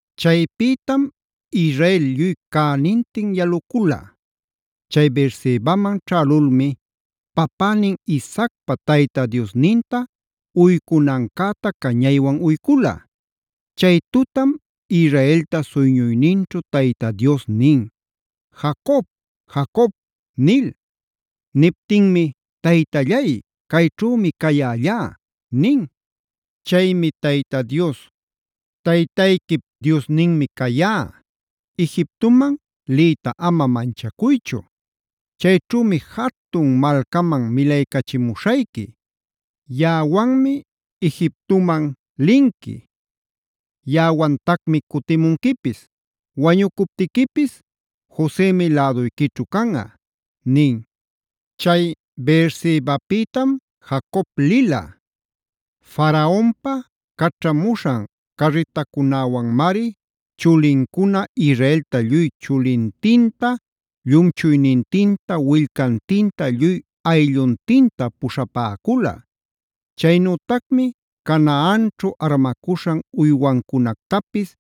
Chaypïtam Israel lluy cänintin yalucula. Chay Beersebaman ćhälulmi papänin Isaacpa Tayta Diosninta uycunancäta cañaywan uycula. Chay tutam Israelta suyñuyninćhu Tayta Dios nin: “¡Jacob! ¡Jacob!” nil. Niptinmi: “Taytallay, cayćhümi cayällá” nin. Chaymi Tayta Dios: “Taytayquip Diosninmi cayá. Egiptoman liyta ama manchacuychu. Chayćhümi jatun malcaman milaycachimuśhayqui. Yaꞌawanmi Egiptoman linqui, yaꞌawantacmi cutimunquipis. Wañucuptiquipis Josemi läduyquićhu canꞌa” nin. Chay Beersebapïtam Jacob lila. Faraonpa caćhamuśhan carritacunäwanmari chulincuna Israelta lluy chulintinta, llumchuynintinta, willcantinta lluy aylluntinta puśhapäcula. Chaynütacmi Canaanćhu armacuśhan uywancunactapis,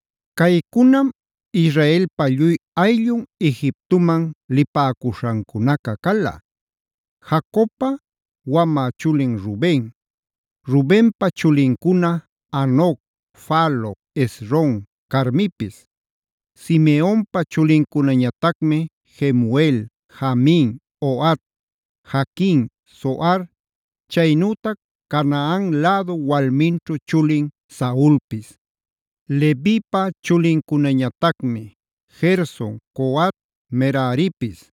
Caycunam Israelpa lluy ayllun Egiptoman lipäcuśhancunaca cala: Jacobpa wamä chulin Ruben. Rubenpa chulincuna: Hanoc, Falu, Hezron, Carmipis. Simeonpa chulincunañatacmi: Jemuel, Jamin, Ohad, Jaquin, Zohar; chaynütac Canaan lädu walminćhu chulin Saulpis. Levipa chulincunañatacmi: Gerson, Coat, Meraripis.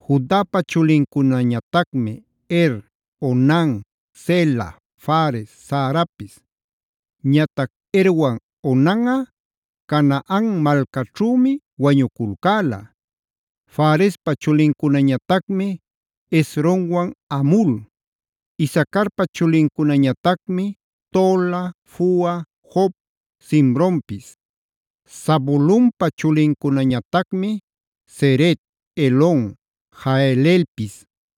Judapa chulincunañatacmi: Er, Onan, Sela, Fares, Zarapis. Ñatac Erwan Onanꞌa Canaan malcaćhümi wañuculcäla. Farespa chulincunañatacmi: Hezronwan Hamul. Isacarpa chulincunañatacmi: Tola, Fua, Job, Simronpis. Zabulonpa chulincunañatacmi: Sered, Elon Jahleelpis.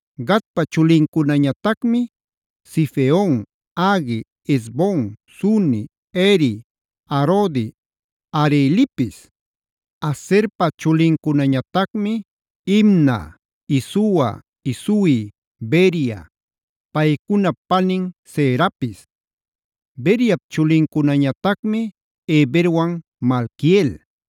Gadpa chulincunañatacmi: Zifion, Hagui, Ezbon, Suni, Eri, Arodi, Arelipis. Aserpa chulincunañatacmi: Imna, Isua, Isui, Beria, paycunap panin Serapis. Beriap chulincunañatacmi: Heberwan Malquiel.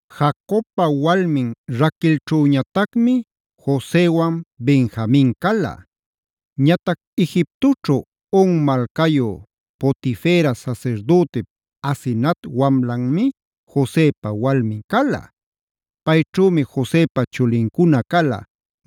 Jacobpa walmin Raquelćhüñatacmi Josewan Benjamin cala. Ñatac Egiptoćhu On malcayu Potifera sasirdütip Asenat wamlanmi Josepa walmin cala. Payćhümi Josepa chulincuna cala: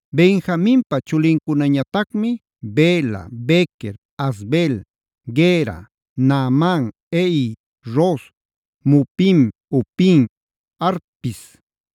Benjaminpa chulincunañatacmi: Bela, Bequer, Asbel, Gera, Naaman, Ehi, Ros, Mupim, Hupim, Ardpis.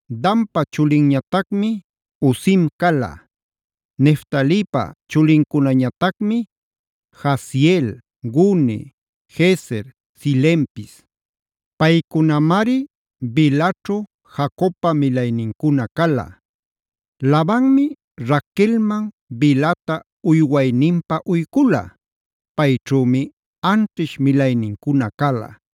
Danpa chulinñatacmi: Husim cala. Neftalipa chulincunañatacmi: Jahzeel, Guni, Jezer, Silempis. Paycunamari Bilhaćhu Jacobpa milaynincuna cala. Labanmi Raquelman Bilhata uywayninpä uycula. Payćhümi anćhish milaynincuna cala.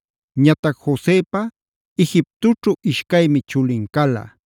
Ñatac Josepa Egiptoćhu ishcaymi chulin cala.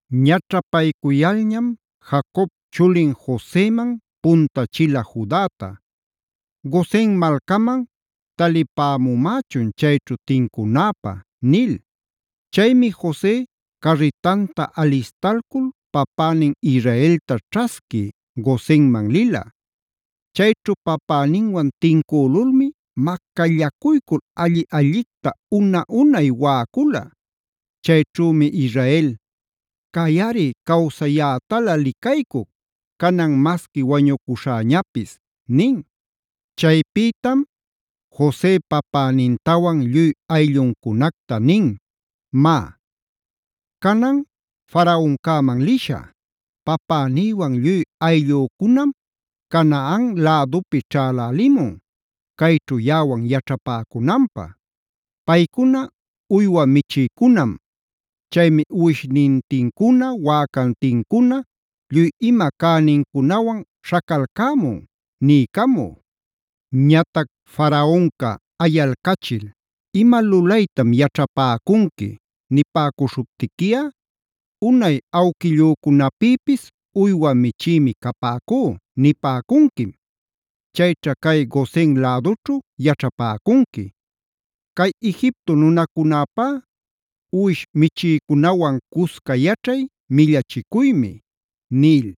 Ñaćhapaycuyalñam Jacob chulin Joseman puntachila Judata: “Gosen malcaman talipämumächun chayćhu tincunäpä” nil. Chaymi Jose carritanta alistalcul papänin Israelta ćhasqui Gosenman lila. Chayćhu papäninwan tincülulmi macallacuycul alli-allicta una-unay waꞌacula. Chayćhümi Israel: “¡Cayꞌari cawsayätalä licaycuc! ¡Canan masqui wañucuśhäñapis!” nin. Chaypïtam Jose papänintawan lluy aylluncunacta nin: “Má, canan Faraoncäman lishä: ‘Papänïwan lluy ayllücunam Canaan lädupi ćhälälimun, cayćhu yaꞌawan yaćhapäcunanpä. Paycuna uywa michïcunam. Chaymi uwishnintincuna, wäcantincuna, lluy ima cänincunawan śhacalcämun’ niycamü. Ñatac Faraonca ayalcachil: ‘¿Ima lulaytam yaćhapäcunqui?’ nipäcuśhuptiquiꞌa, ‘Unay awquillücunapïpis uywa michïmi capäcú’ nipäcunquim. Chayćha cay Gosen lädućhu yaćhapäcunqui. Cay Egipto nunacunäpá uwish michïcunawan cusca yaćhay millachicuymi” nil.